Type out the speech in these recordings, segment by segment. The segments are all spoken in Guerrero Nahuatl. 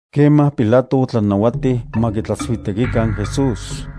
Kemaj Pilato otlanauatij ma kitlatsuitekikan Jesús.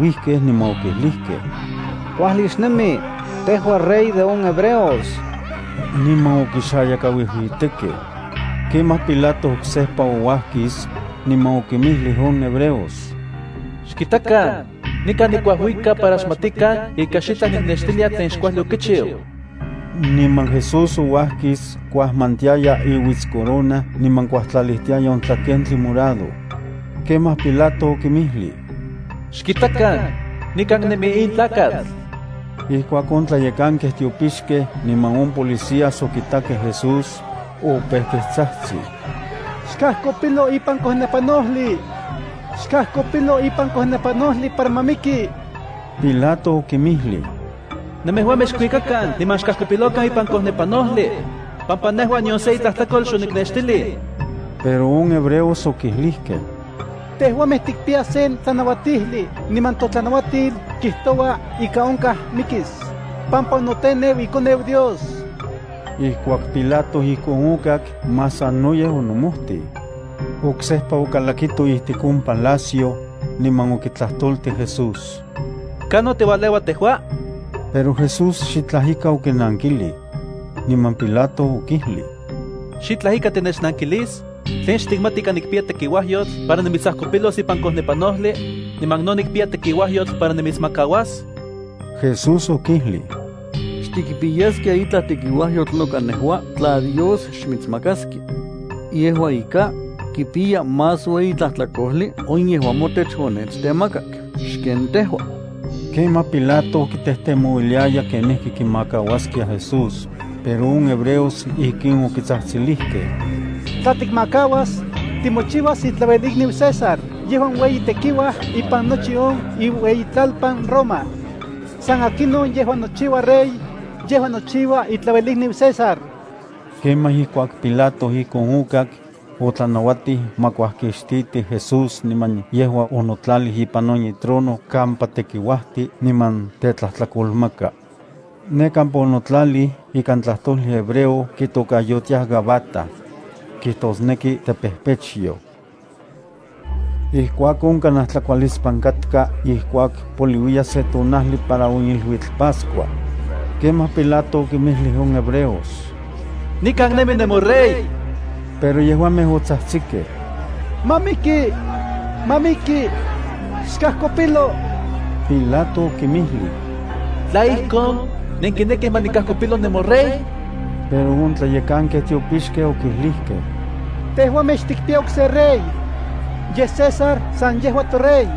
Kemaj okinisiuijkej, niman okijlijkej: —¡Kuajli xnemi, tejua Rey de on hebreos! Niman okixayakauijuitekej. Kemaj Pilato oksejpa ouajkis, niman okinmijlij on hebreos: —Xkitakan, nikan nikuajuika para xmatikan ika xitlaj niknextilia tlen xkuajli okichiu. Niman Jesús ouajkis kuajmantiaya iuitscorona niman kuajtlalijtiaya on tlakentli morado. Kemaj Pilato okinmijlij: —¡Xkitakan, nikan nemi in tlakatl! Ijkuak on tlayekankej tiopixkej niman on policías okitakej Jesús, opejkej tsajtsij: —¡Xkajkopilo ipan kojnepanojli! ¡Xkajkopilo ipan kojnepanojli para ma miki! Pilato okinmijlij: —Nemejuamej xkuikan niman xkajkopilokan ipan kojnepanojli, pampa nejua nion se itlajtlakol xoniknextilij. Pero on hebreos okijlijkej: —Tejuamej tikpiyaj sen tlanauatijli niman totlanauatil kijtoua ika onkaj mikis, pampa onoteneu iKoneu Dios. Ijkuak Pilato ijkon okak, más sanoyej onomojtij. Oksejpa okalakito ijtik on palacio, niman okitlajtoltij Jesús: —¿Kanon tiualeua tejua? Pero Jesús xitlaj ika okinankilij. Niman Pilato okijlij: —¿Xitlaj ika tinechnankilis? ¿Tlen xtikmati ika nikpiya tekiuajyotl para nimitsajkopilos ipan kojnepanojli, niman no nikpiya tekiuajyotl para nimitsmakauas? Jesús okijlij: —Xtikpiyaskia itlaj tekiuajyotl noka nejua tla Dios xmitsmakaskia. Yejua ika, kipiya más ueyi tlajtlakojli on yejuan motech onechtemakak xken tejua. Kemaj Pilato kitejtemouiliaya kenijki kimakauaskia Jesús, pero on hebreos ijkin okitsajtsilijkej: —¡Tla tikmakauas, timochiuas itlauelikniu César yejuan iueyitekiuaj ipan nochi on iueyitlalpan Roma! ¡San akinon yejuan nochiua rey, yejua nochiua itlauelikniu César! Kemaj ijkuak Pilato ijkon okak, otlanauatij ma kuajkixtitij Jesús niman yejua onotlalij ipan on itrono kampa tekiuajti niman tetlajtlakolmaka. (Ne kampa onotlalij ikan tlajtojli hebreo kitokayotiaj Gabata. Kijtosneki tepejpechyoj.) Ijkuakon, kanaj tlakualispan katka ijkuak poliuiya se tonajli para on iluitl Pascua. Kemaj Pilato okinmijlij on hebreos: —¡Nikan nemi nemoRey! Pero yejuamej otsajtsikej: —¡Ma miki! ¡Ma miki! ¡Xkajkopilo! Pilato okinmijlij: —¿Tla ijkon, nenkinekij ma nikajkopilo nemoRey? Pero on tlayekankej tiopixkej okijlijkej: —Tejuamej xtikpiyaj okse rey. Yej, César san yejua torey.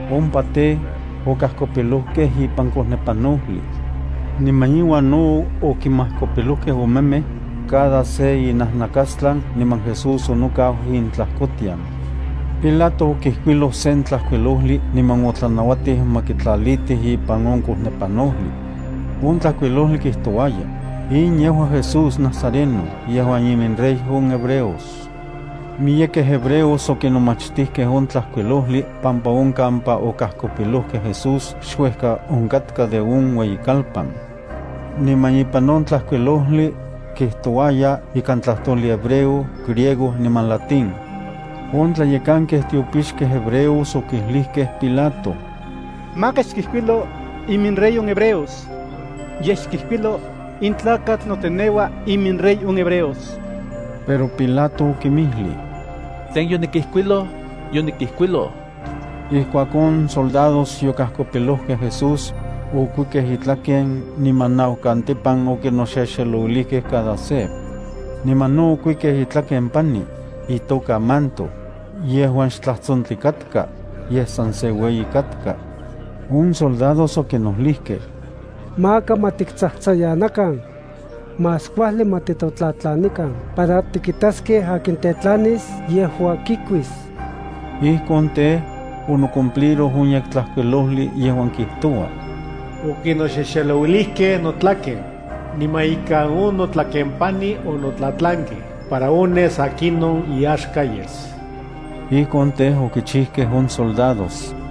Ompa tej, okajkopilojkej ipan kojnepanojli. Niman iuan no okinmajkopilojkej omemej, cada se inajnakastlan niman Jesús onokau intlajkotian. Pilato okijkuiloj sen tlajkuilojli niman otlanauatij ma kitlalitij ipan on kojnepanojli. On tlajkuilojli kijtouaya: “In yejua Jesús Nazareno yejuan iminRey on hebreos.” Miyekej hebreos okinomachtijkej on tlajkuilojli pampa on kampa okajkopilojkej Jesús xuejka onkatka de on ueyikalpan. Niman ipan on tlajkuilojli, kijtouaya ikan tlajtojli hebreo, griego niman latín. On tlayekankej tiopixkej hebreos okijlijkej Pilato: —Maka xkijkuilo “IminRey on hebreos.” Yej xkijkuilo: “In tlakatl noteneua iminRey on hebreos.” Pero Pilato okinmijlij: —Tlen yonikijkuiloj, yonikijkuiloj. Ijkuak on soldados yokajkopilojkej Jesús, okuikej itlaken niman naukantipan okinoxexelouilijkej cada se. Niman no okuikej itlaken pani, itoka manto, yejuan xtlajtsontli katka, yej san se ueyi katka. On soldados okinojlijkej: —Maka ma tiktsajtsayanakan. Más kuajli ma titotlatlanikan para tikitaskej akin tetlanis yejua kikuis. Ijkon tej, onocumpliroj on Yektlajkuilojli yejuan kijtoua: “Okinoxexelouilijkej notlaken niman ika on notlakempani onotlatlankej para ones akinon iyaxka yes.” Ijkon tej, okichijkej on soldados.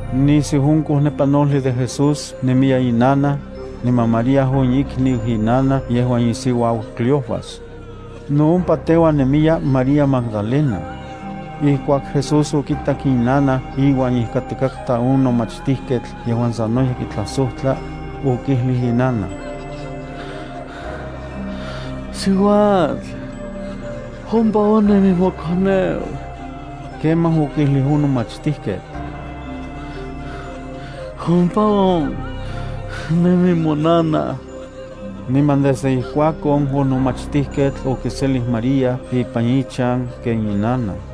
Nisiu on kojnepanojli de Jesús nemiya inanaj, niman María on ikniu inanaj yejuan isiuau Cleofas. No ompa teuan nemiya María Magdalena. Ijkuak Jesús okitak inanaj iuan ijkatikaj on nomachtijketl yejuan sanoyej kitlajsojtla, okijlij inanaj: —Siuatl, ompa on nemi mokoneu. Kemaj okijlij on nomachtijketl: —Ompa on nemi monanaj. Niman desde ijkuakon on nomachtijketl okiselij María ipan ichan ken inanaj.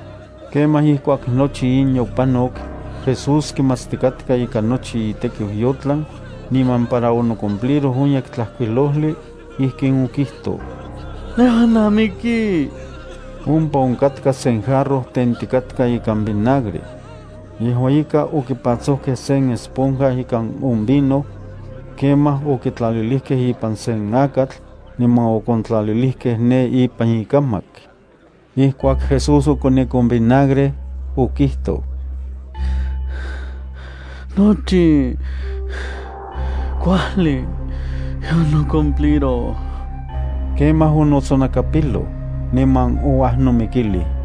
Kemaj ijkuak nochi in yopanok, Jesús kimatstikatka ika nochi itekiu yotlan, niman para onocumpliroj on Yektlajkuilojli, ijkin okijtoj: —Nejua namiki. Ompa onkatka sen jarro tentikatka ikan vinagre. Yejua ika okipatsojkej sen esponja ikan on vino. Kemaj okitlalijkej ipan sen akatl, niman okontlalilijkej ne ipan ikamak. Ijkuak Jesús okonik on vinagre, okijtoj: —Nochi kuajli yonocumpliroj. Kemaj onotsonakapiloj, niman ouajnomikilij.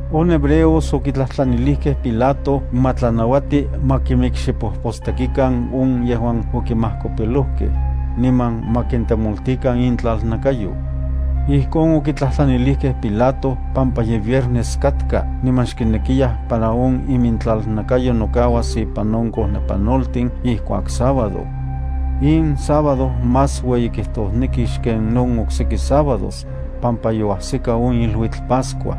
On hebreos okitlajtlanilijkej Pilato ma tlanauati ma kimikxipojpostekikan on yejuan okinmajkopilojkej, niman ma kintemoltikan intlalnakayo. Ijkon okitlajtlanilijkej Pilato pampa ye viernes katka niman xkinekiyaj para on imintlalnakayo nokauas ipan on kojnepanoltin ijkuak sábado. In sábado más ueyikijtosneki xken on okseki sábados, pampa yoajsika on iluitl Pascua.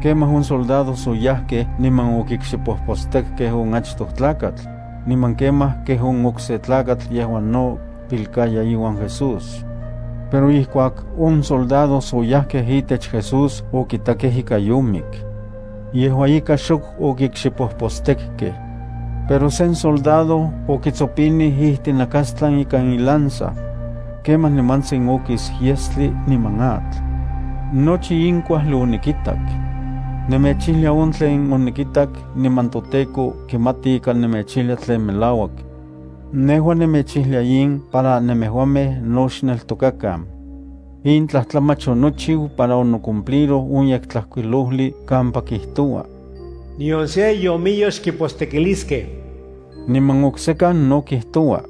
Kemaj on soldados oyajkej niman okikxipojpostekkej on achtoj tlakatl, niman kemaj kej on okse tlakatl yejuan no pilkaya iuan Jesús. Pero ijkuak on soldados oyajkej itech Jesús okitakej ika yomik. Yejua ika, xok okikxipojpostekkej. Pero sen soldado okitsopinij ijtinakastlan ikan ilanza. Kemaj nimantsin okis yestli niman atl. Nochi in kuajli onikitak. Nemechijlia on tlen onikitak niman toTEKO kimati ika nemechijlia tlen melauak. Nejua nemechijlia in para nemejuamej no xneltokakan. In tlajtlamach onochiu para onocumpliroj on Yektlajkuilojli kampa kijtoua: “Nion se iomiyo xkipostekiliskej.” Niman oksekan no kijtoua: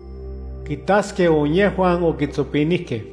“Kitaskej on yejuan okitsopinijkej.”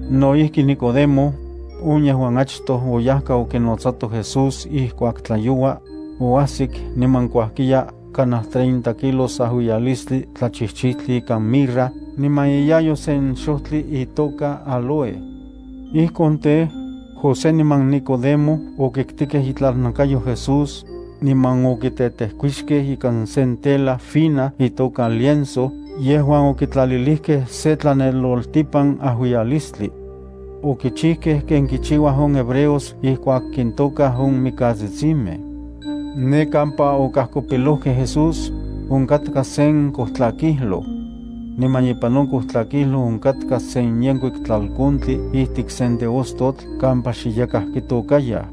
No ijki Nicodemo, on yejuan achtoj oyajka okinotsato Jesús ijkuak tlayoua, oajsik niman kuajkiya kanaj treinta kilos ajuiyalistli tlachijchijtli ikan mirra niman iyayo sen xojtli itoka áloe. Ijkon tej, José niman Nicodemo okiktikej itlalnakayo Jesús, niman okitetejkuixkej ikan sen tela fina itoka lienzo yejuan okitlalilijkej se tlaneloltipan ajuiyalistli. Okichijkej ken kichiuaj on hebreos ijkuak kintokaj on mikatsistimej. Ne kampa okajkopilojkej Jesús, onkatka sen kojtlakijloj. Niman ipan on kojtlakijloj onkatka sen yenkuik tlalkontli ijtik sen teostotl kampa xe yakaj kitôkayaj.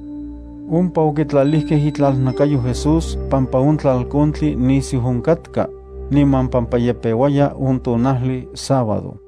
Ompa okitlalijkej itlalnakayo Jesús pampa on tlalkontli nisiu onkatka, niman pampa ye peuaya on tonajli sábado.